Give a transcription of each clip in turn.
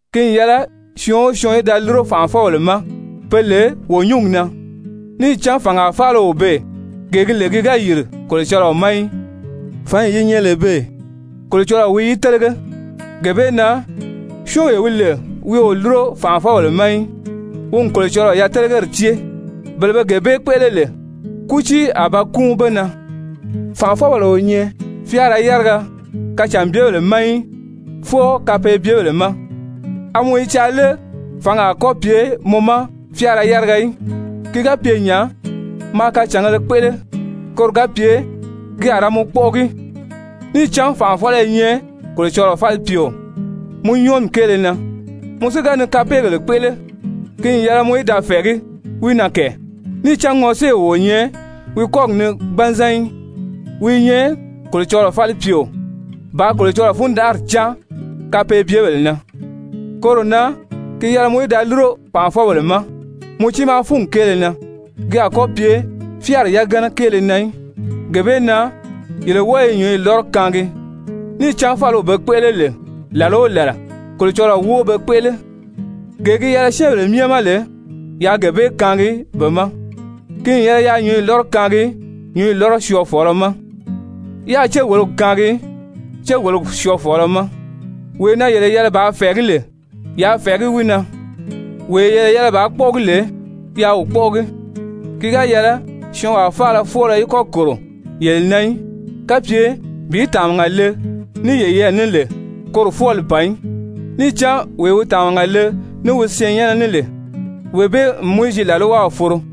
Ki n yɛlɛ syɔɔn o syɔɔn í da lúro fànʔafɔbèle ma pe lè wo nyúngi na. Níì cán fàngaa faala o beè gee gi lè ki ga yìri Kolocɔlɔɔ ma í, fǎnyi yi nyɛ lè beè, Kolocɔlɔɔ wi yi télege. Gee bee na syɔ́ɔnwee wi lè wi o lúro fànʔafɔbèle ma í, wi n Kolocɔlɔɔ yatelegeyi cée, bele be gee bee kpéʔele lè, kútii a ba kúun be na. Fànʔafɔbèle o nyɛ fyáara yáriya kacànbyebèle ma í, fwɔɔ kapeebyebèle ma. A mɔ i caa lé fǎngi a kɔ́ pye mɔ ma fyáara yáriga í? Ki ga pye nya, maa kacàngēle kpéʔele, koro ga pye ki a ra mɔ kpɔ́ʔɔgi, níì cán fànʔafɔlɔ i nyɛ Kolocɔlɔɔ falipyeo mɔ nyɔɔmi kéele na. Mɔ si ga ni kapeegèle kpéʔele, ki n yɛlɛ mɔ í da fɛ̀ɛgí wi na kɛ. Níì cán ŋɔséew o nyɛ wi kɔ́gi ni gbanzan í, wi i nyɛ Kolocɔlɔɔ falipyeo bàā Kolocɔlɔɔ fundanʔari cáan kapeebyebèle na. Koro na gi yɛlɛ mɔ í da lúro fànʔafɔbèle ma mɔ tiimaa fúngi kéele na, ki a kɔ́ pye fyáari yagana kéele na í. Gee bee na yele wɔ́ɔ i nyǔnyi lɔ́rɔ kaangi. Níì cán fáliw be kpéʔele lè làla o làla, Kolocɔlɔɔ wóo be kpéʔele. Gee gi yɛlɛ syɛ́ɛnbèle myɛ ma lè, yaa gee bee kaangi be ma, ki n yɛlɛ yaa nyǔnyi lɔ́rɔ kaangi nyǔnyi lɔ́rɔ syɔɔfɔlɔ ma, yáā céwologi kaangi céwologi syɔɔfɔlɔ ma, wee na yele yɛlɛ bàā fɛ̀ɛgí lè, yaa fɛ̀ɛgí wi na, wee yele yɛlɛ bàā kpɔ́ʔɔgi lè, yaa wi kpɔ́ʔɔgi. Ki ga yɛlɛ syɔɔnwaa faala fwɔ́ɔlɔ í kɔ́ kòro yele na í, kapye bi tàmaga le ní yeyɛɛ ní lè, koro fwɔ́ɔli ban í. Níì cán wee wi tàmaga le ní wi syɛɛnnyɛnnɛ ní lè, wee bee n Mowizi làlwaw foro.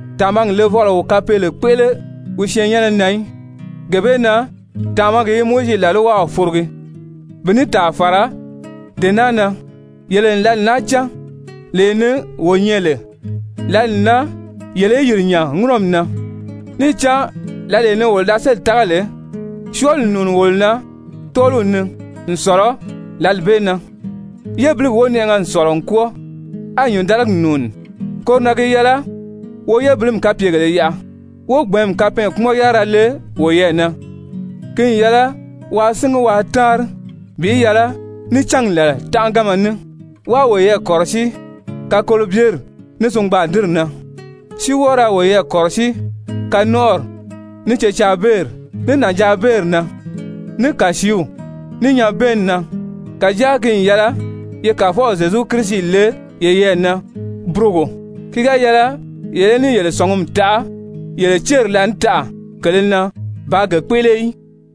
Tàmagi levɔlɔ o kapeele kpéʔele wi syɛɛnnyɛnnɛ na í, gee bee na tàmagi i Mowizi làlwaw forogi. Bi ní tàa fàra dee naa na, yele n lǎli naa cán, lee ni wo nyɛ lè, lǎli n nan yele í yìri nya ŋúnɔmi na, níì cán lǎlee ni wolo da sélì tága lè, syɔɔli n nùuni wolo na tɔ́ɔliw ni n sɔ̀lɔ lǎli bee na. Yébiligi wonɛʔɛgɛ n sɔ̀lɔ n kwɔ́ɔ, á nyǐndaligi nùuni. Koro na gi yɛlɛ wo yébilimi kapyegèlē yaʔa wó gbɛ̀ɛ́nmi kapɛɛnkpumɔn-yárira le woyɛɛ na. Ki n yɛlɛ waa síngi waa táanri bi yɛlɛ ní cángi làla tánʔaganma ní, wáā woyɛɛ kɔ̀rɔsíi kakolobyeri ní singbaadinri na, si wɔ́ɔ ra woyɛɛ kɔ̀rɔsíi kanɔnʔɔri, ní cecaabeeri, ní nànjaabeeri na, ní kàsiiw, ní nyabɛɛnni na. Kàjáa ki n yɛlɛ ye Kàfɔw Zyezu Kirisi le yeyɛɛ na burogo ki ga yɛlɛ yele í ní yele sɔ̀ngumi taʔa yele céri laànitaʔa kele na bàā ge kpéʔele í.